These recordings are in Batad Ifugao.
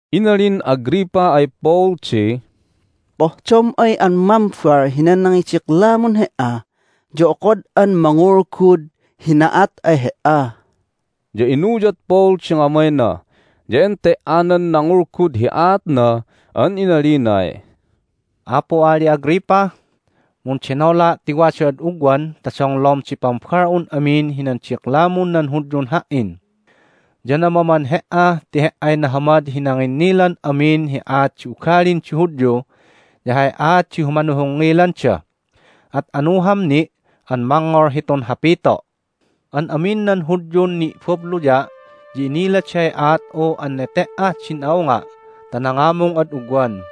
Inalin Agrippa ay Paul di, "Pohdom ay an mambal hinan nangidiklamun he"a ya okod'an mangulgud hi na'at ay he"a." Ya inuyad Paul di ngamayna, ya ente"anan nangulgud hi aatna an inalinay, "Apu Ali Agrippa, mundenola' ti wada'ad ugwan ta donglom di pambal'un amin hinan diklamun nan Hudyun ha"in! Ya namaman he"a ti he"ay nahamad hi nanginnilan amin hi aat di ugalin di Hudyu ya hay aat di humanohongngilanda. At anuham ni' an mangngol hitun hapito'. An amin nan Hudyun ni'babluya' ya iniladay aat'u an nete"ah din a'unga' ta nangamung ad ugwan,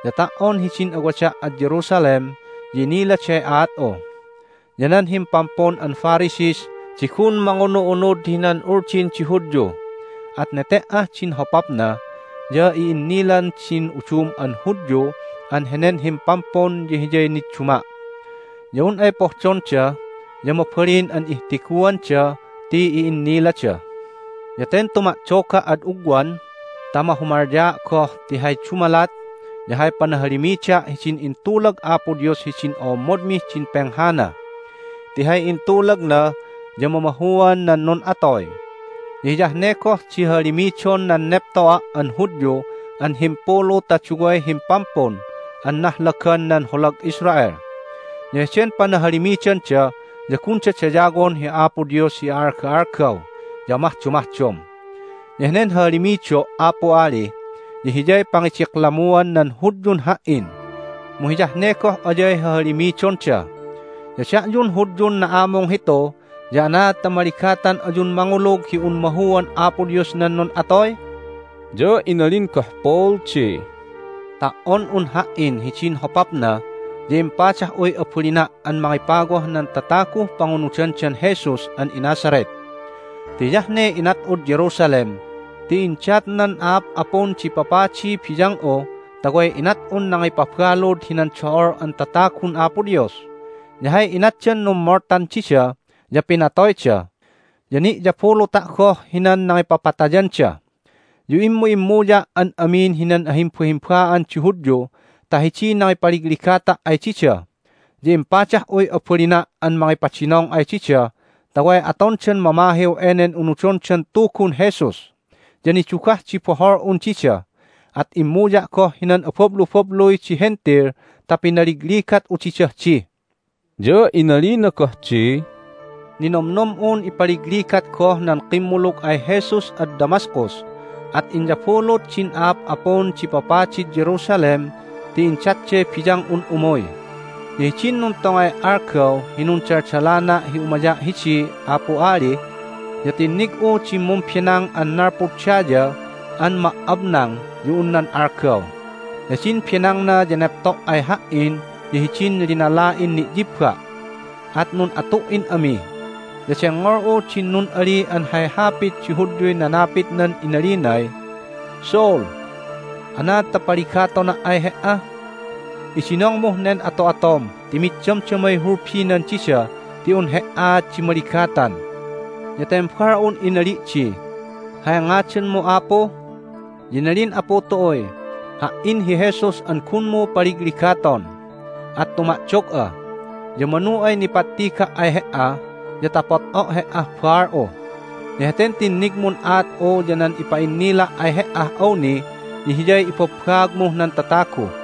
ya ta"on hidin awada' ad Jerusalem ya iniladay aat'u. Ya nan himpampun an Pharisees di gun mangunu'unud hinan Uldin di Hudyu, at nete"ah din hopapna ya i'innilan din udum an Hudyu an henen himpampun ya hiyay nidduma'. Ya un ay pohdonda ya mabalin an ihtiguanda ti i'innilada. Ya ten tuma'doga' ad ugwan ta mahumalyaa' goh ti hay dumalat ya hay panahalimida' hidin intulag Apo Dios hidin o'ommodmih din penghana. Ti hay intulagna ya mamahuan nan nun'atoy, ya hiyah ne goh di hahalimidon nan nepto'a' an Hudyu an himpulu ta duway himpampun an nahlagan nan holag Israel. Ya heden panahalimidanda ya gunda dayawon hi Apo Dios hi a'alga'algaw ya amahdomahdom. Ya henen hahalimido', Apu Ali, ya hiyay pangidiklamuan nan Hudyun ha"in, mu hiyah ne goh ayay hahalimidonda! Ya da'yun Hudyun na'amung hitu ya anaad ta maligatan ayun mangulug hi un mahuan Apo Dios nan nun'atoy?" Ya inalin goh Paul di, "Ta"on un ha"in hidin hopapna ya impadah'uy abalina' an mangipawah nan tataguh pangunudandan Jesus an iNazareth. Ti hiyah ne inat'ud Jerusalem ti indat nan a'ap'apun di papadiy biyang'u ta way inat'un nangipabalud hinan do'ol an tatagun Apo Dios, ya hay inatdan nummoltan dida ya pinatoyda, ya ni'yabuluta' goh hinan nangipapatayanda. Ya immu'immuya' an amin hinan ahimbahimba'an di Hudyu ta hidiy nangipaligligata' ay dida, ya impadah'uy abalina' an mangipadinong ay dida ta way atondan mamahiw enen unudondan Tugun Jesus. Ya nidugah di bohol'un dida, at immuya' goh hinan abablubabluy di Hentil ta pinaligligat'u didah di." Ya inalina goh di, "Ninomnom'un ipaligligat goh nan kimmulug ay Jesus ad Damascus, at inyabulut din a'ap'apun di papadid Jerusalem ti indatday biyang'un umuy. Ya hidin nuntongay algaw hi nundaldalana' hi umaya' hidi, Apu Ali, ya tinnig'u din mumbenang an nalpud daya an ma"abnang ya un nan algaw. Ya din benangna ya nepto' ay ha"in ya hidin linala'in ni'yibba'. At nun'atu"in ami, ya dengngol'u din nun'ali an hay hapit di Hudyuy nanapitnan inalinay, Saul, anaad ta paligatona' ay he"a? Idinongmuh nen ato'atom ti mid damdamay hulbinan dida ti un he"aat di maligatan. Ya tembal'un inali' di, Hay ngadanmu, Apu? Ya inalin Apu tu'uy, Ha"in hi Jesus an gunmu paligligaton! At tuma'dog'a. Ya manu ay nipattiga' ay he"a ya ta pot'o' he"ah baal'u. Ya heten tinnigmun aat'u ya nan ipa'innila' ay he"ah awni ya hiyay ibabbaagmuh nan tatagu.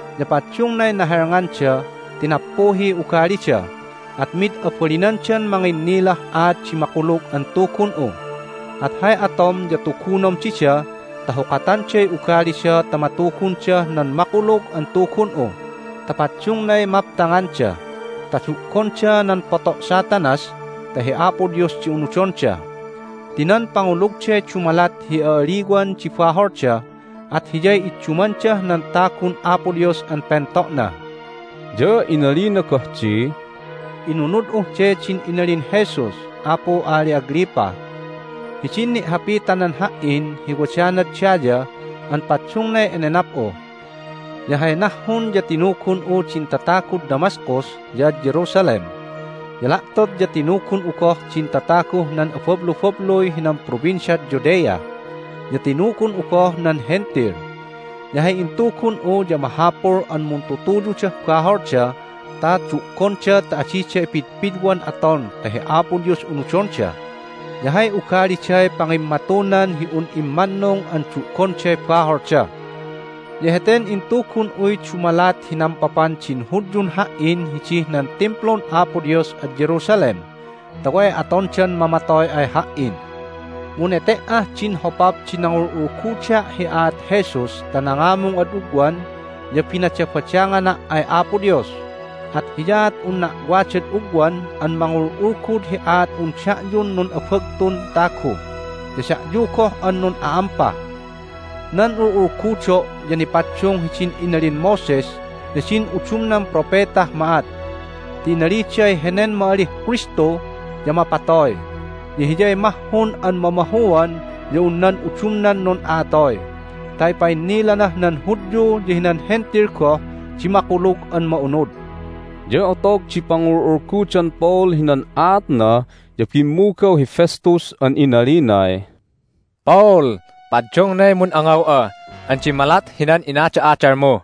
Ya paddungnay nahelnganda ti nappuhiy ugalida, at mid abalinandan manginnilah aat di Makulug an Tugun'u. At hay atom ya tugunom dida ta hukatanday ugalida ta matugundah nan Makulug an Tugun'u ta paddungnay maptanganda, ta du'gonda nan poto' Satanas ta hi Apo Dios di unudonda. Ti nan pangulugday dumalat hi a'aliwan di baholda, at hiyay iddumandah nan tagun Apo Dios an pento'na." Ya inalina goh di, "Inunud'uh de din inalin Jesus, Apu Ali Agrippa, hidin ni'hapitanan ha"in hi wadanad daya an paddungnay enenap'u. Ya hay nahhun ya tinugun'u din tatagud Damascus ya ad Jerusalem, ya la'tot ya tinugun'u goh din tataguh nan abablubabluy hinan Provinciad Judea, ya tinugun'u goh nan Hentil. Ya hay intugun'u ya mahapul an muntutuyudah baholda ta du'gonda ta adida ipidpidwan aton ta hi Apo Dios unudonda, ya hay ugaliday pangimmatunan hi un immannung an du'gonday baholda. Ya heten intugun'uy dumalat hi nampapan din Hudyun ha"in hidih nan Timplun Apo Dios ad Jerusalem, ta way atondan mamatoy ay ha"in. Mu nete"ah din hopap di nangul'ulguda' hi aat Jesus ta nangamung ad ugwan ya binadabadangana' ay Apo Dios. At hiyaat unna' wadad ugwan an mangul'ulgud hi aat'un da'yun nun'abagtun tagu ya da'yu goh an nun'a'ampa. Nan ul'ulgudo' ya nipaddung hidin inalin Moses ya din udumnan propetah ma'at ti inaliday henen ma'alih Kristu ya mapatoy, ya Hiyay mahhun an mamahuan ya un nan udumnan nun'a'atoy ta ipa'innilanah nan Hudyu ya hinan Hentil goh di Makulug an Ma'unud." Ya otog di pangul'ulgudan Paul hinan aatna ya bimmugaw hi Festus an inalinay, "Paul! Paddungnay mun'angaw'a an dimmalat hinan inada'adalmu!"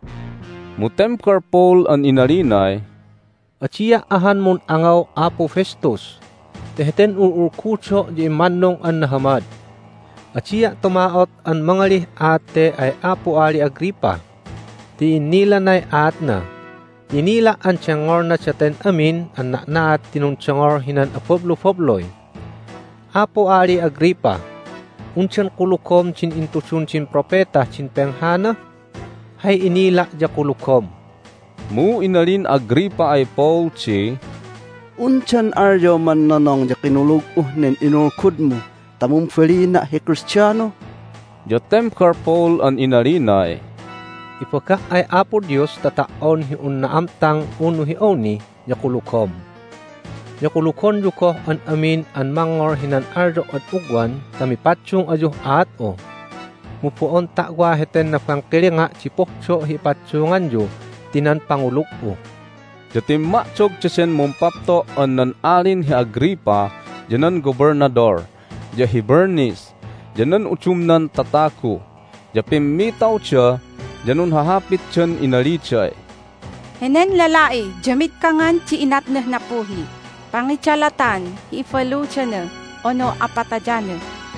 Mu tembal Paul an inalinay, "Adia' ahan mun'angaw, Apu Festus, ti heten ul'ulgudo' ya immannung an nahamad! Adia' tuma'ot an mangalih aat te ay Apu Ali Agrippa ti i'innilanay aatna, ti inila' an dengngolna daten amin an na'na'at ti nundongol hinan abablubabluy. Apu Ali Agrippa, undan kulugom din intudun din propetah din penghana? Hay inila' ya kulugom!" Mu inalin Agrippa ay Paul di, "Undan alyoman nonong ya kinulug'uh nen inulgudmu ta mumbalina' hi Kristiano?" Ya tembal Paul an inalinay, "Ibaga' ay Apo Dios ta ta"on hi un na'amtang unu hi awni ya kulugom! Ya kulugonyu goh an amin an mangngol hinan alyo' ad ugwan ta mipaddung ayuh aat'u! Mu bo'on ta'wa heten nabangkilinga' di pohdo' hi ipaddunganyu, ti nan pangulug'u!" Ya timma'dog daden mumpapto' an nan Alin hi Agrippa, ya nan Gobelnadol, ya hi Bernice, ya nan udumnan tatagu, ya pimmitawda, ya nunhahapitdan inaliday, "Henen lala'i ya mid kangan di inatnah nappuhih pangidalatan hi ibaludana unu apatayana."